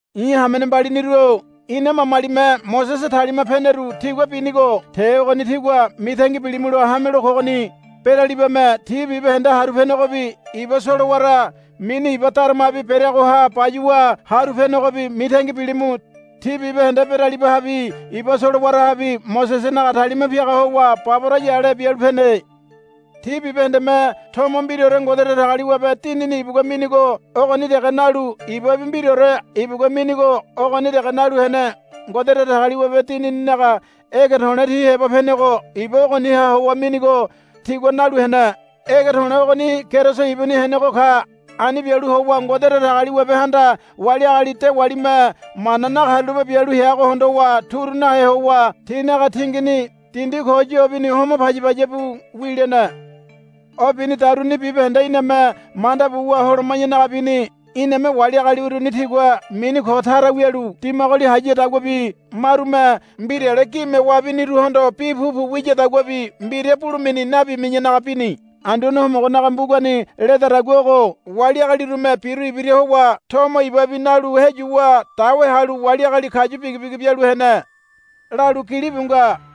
I̱ hamene mbaliniru-o ina mamalime Mosese talima peneru tigua binigo te ogoni tígua mitangi bilimulo hamelo kogoni. Beralibame ti bibahende haru penegobi iba solowara mini Iba Daramabi bereagoha bayuwa haru penegobi mitangi bilimu. Ti bibahende beralibahabi iba solowarahabi Mosesenaga talima piaga howa baboraya ale bialu pene. Ti bibahendeme tomo mbiraore Ngode Datagaliwabe Dinini ibugua minigo ogoni dege nalu ibabi mbiraore ibugua minigo ogoni dege nalu hene. Ngode Datagaliwabe Dinininaga ege to̱le̱ ti heba penego iba ogoniha howa minigo tigua nalu hene. Ege to̱le̱ ogoni Keriso ibuni henego ka. Ani bialu howa Ngode Datagaliwabehanda wali agali dewalime mana nakarulape bialu heago hondowa turu nahe howa tinaga tingini dindi ko yobi homo paya paya bu wilene. O binidaruni bibahende iname manda buwa holoma̱yanaga bini. Iname wali agali uruni tigua mini ko tara wialu dimagoli hayadaguabi marume mbirale gime wabiniruhondo bi pupu wiyadaguabi mbira bulemini nabimi̱yanaga bini. Anduane Homogonaga mbugani ledadagua ogo, Wali agalirume biru ibira howa tomo ibabi nalu heyuwa dawe halu wali agali kayu bigibigi bialu hene, lalu gilibu nga.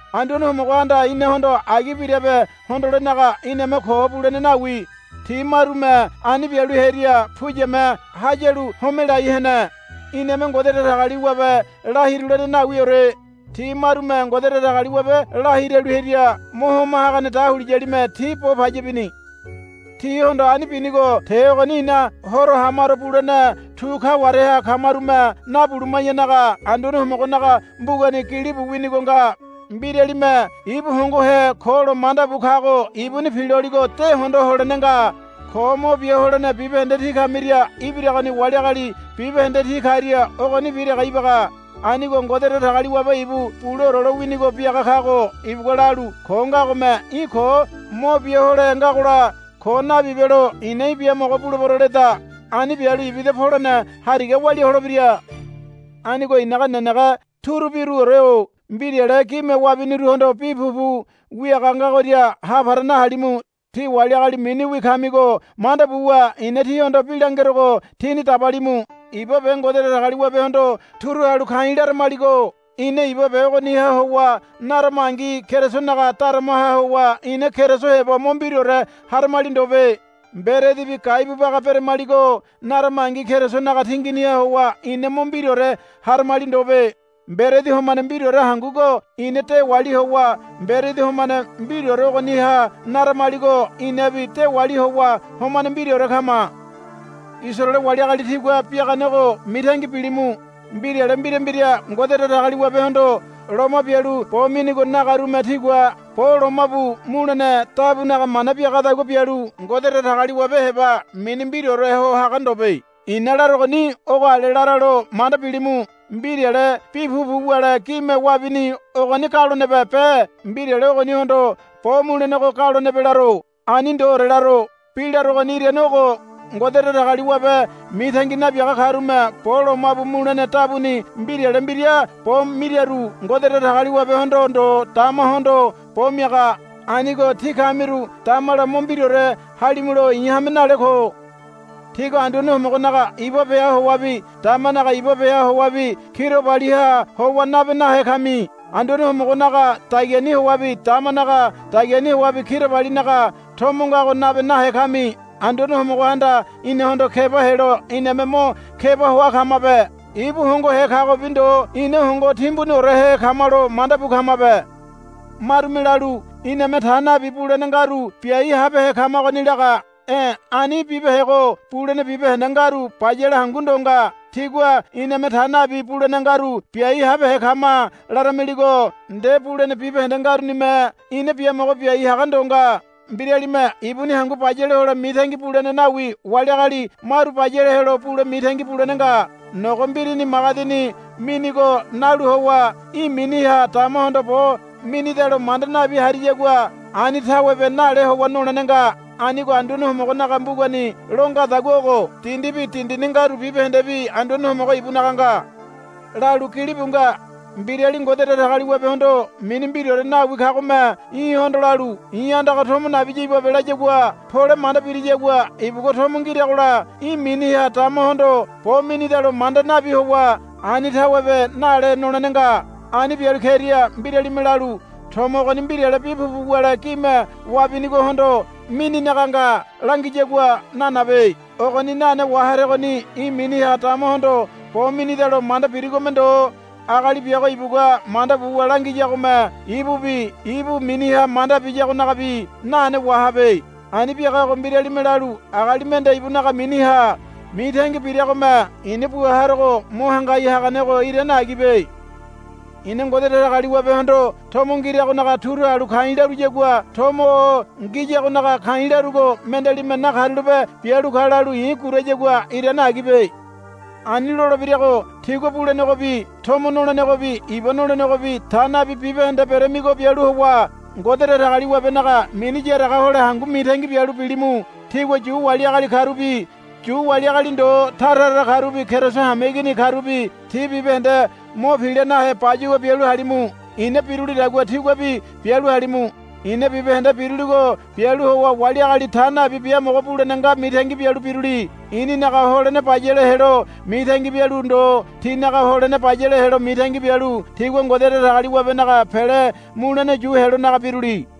Anduane Homogohanda inahondo agi birabe hondolenaga iname ko bulene nawi. Ti marume ani bialu hearia puyame hayalu homelai hene. Iname Ngode Datagaliwabe la hirulene nawiore. Ti marume Ngode Datagaliwabe la hiralu hearia Mo Homa Hagane Dahuliyalime ti bo paya bini. Tihondo ani binigo te ogoni ina horo hamaro bulene tu kawareha kamarume nabuluma̱yanaga Anduane Homogonaga mbugani gilibu winigo nga. Mbiralime ibu hongohe ko lo manda bu kago ibuni piloligo de hondo holene nga. Ko mo bia holene bibahende tí kamiria ibiragoni wali agali bibahende ti karia ogonibi dege ibaga. Anigo Ngode Datagaliwabe ibu buleore lowinigo biaga kago ibugua lalu, Ko ngagome í̠ ko mo bia hole ngagola ko nabibelo i̱na í̠ biamogo bulebero, leda. Ani bialu ibida polene hariga walia holebira. Anigo i̱naga nenege turubiruore-o mbirale gime wabiniruhondo bi pupu wiaga ngagoria ha para nahalimu. Tí wali agali miniwi kamigo manda buwa i̱na tíhondo bi langerogo tíni dabalimu. Iba be Ngode Datagaliwabehondo turu halu ka̱i̱ laramaligo ina iba be ogoniha howa naramangi Kerisonaga daramaha howa ina Keriso heba mo mbiraore haramali ndobe. Mberedibi gaibu baga beramaligo naramangi Kerisonaga tinginiha howa ina mo mbiraore haramali ndobe. Mberedi homane mbiraore hangugo ina dewali howa mberedi homane mbiraore ogoniha naramaligo inabi dewali howa homane mbiraore kama. Isaraele wali agali tigua biaganego mitangi bilimu. Mbirale mbira mbira Ngode Datagaliwabehondo loma bialu bo minigo nagarume tigua bo lomabu mulene dabunaga mana biagadagua bialu Ngode Datagaliwabe heba mini mbiraore ho haga ndobe. I̱na larogoni ogo ale laralo manda bilimu. Mbirale bi pupu wule gime wabini ogoni galonebe be mbirale ogonihondo bo mulenego galonebe laro. Ani ndoore laro. Bi larogoni irane ogo. Ngode Datagaliwabe mitangi nabiaga karume bo lomabu mulene dabuni mbirale mbira bo miraru Ngode Datagaliwabehondo ndo damahondo bo miaga. Anigo tí kamiru damala mo mbiraore halimulo i̱ hame nale ko. Tígua Anduane Homogonaga iba beha howabi damanaga iba beha howabi kirabaliha howa nabe nahe kami. Anduane Homogonaga dagiani howabi damanaga dagiani howabi kirabalinaga tomo ngago nabe nahe kami. Anduane Homogohanda inahondo keba helo iname mo keba hoa kamabe. Ibu hongohe kagobi ndo ina hongo timbuniorehe kamalo manda bu kamabe. Marume lalu, Iname ta nabi bulene ngaru biai habehe kamagoni, laga. E̱ ani bibehego bulene bibahende ngaru bayale hangu ndo nga. Tígua, Iname ta nabi bulene ngaru biai habehe kama, laramiligo nde bulene bibahende ngarunime ina biamogo biai haga ndo nga. Mbiralime ibuni hangu bayale hole mitangi bulene nawi wali agali maru bayale helo bule mitangi bulene nga. Nogo mbirini magedini minigo nalu howa í̠ miniha damahondo bo minidalo manda nabi hariyagua ani tawebe nale howa nolene nga. Anigo Anduane Homogonaga mbugani lo ngadagua ogo, Dindibi dindini ngaru bibahendebi Anduane Homogo ibunaga nga, lalu gilibu nga. Mbirali Ngode Datagaliwabehondo mini mbiraore nawi kagome í̠hondo lalu, I̱ andaga tomo nabiya ibabe, layagua pole manda biriyagua ibugua tomo ngiragola í̠ miniha damahondo bo minidalo manda nabi howa ani tawebe nale nolene nga. Ani bialu keria mbiralime lalu, Tomo ogoni mbirale bi pupu wule gime wabinigohondo mininaga nga, langiyagua nanabe. Ogoni nane waharegoni í̠ miniha damahondo bo minidalo manda birigome ndo agali biago ibugua manda buwa langiyagome ibubi ibu miniha manda biyagonagabi nane wahabe. Ani biagago mbiralime lalu, Agali mende ibunaga miniha mitangi biragome i̱na bua harogo mo hangai haganego irane agibe. I̱na Ngode Datagaliwabehondo tomo ngiragonaga turu halu ka̱i̱ laruyagua tomo o ngiyagonaga ka̱i̱ larugo mendealime, Nakarulape bialu ka, lalu i̱ gurayagua irane agibe. Ani lolebirago tígua bulenegobi tomo nolenegobi iba nolenegobi ta nabi bibahende beramigo bialu howa Ngode Datagaliwabenaga mini yaraga hole hangu mitangi bialu bilimu. Tígua Yu wali agali karubi Yu wali agali ndo tara tara karubi Keriso hameigini karubi ti bibahende mo pila nahe bayuwa bialu halimu. I̱na birulidagua tíguabi bialu halimu. I̱na bibahende biruligo bialu howa wali agali ta nabi biamogo bulene nga mitangi bialu biruli. I̱ninaga holene bayale helo mitangi bialu ndo tinaga holene bayale helo mitangi bialu tigua Ngode Datagaliwabenaga pele mulene yu helonaga biruli.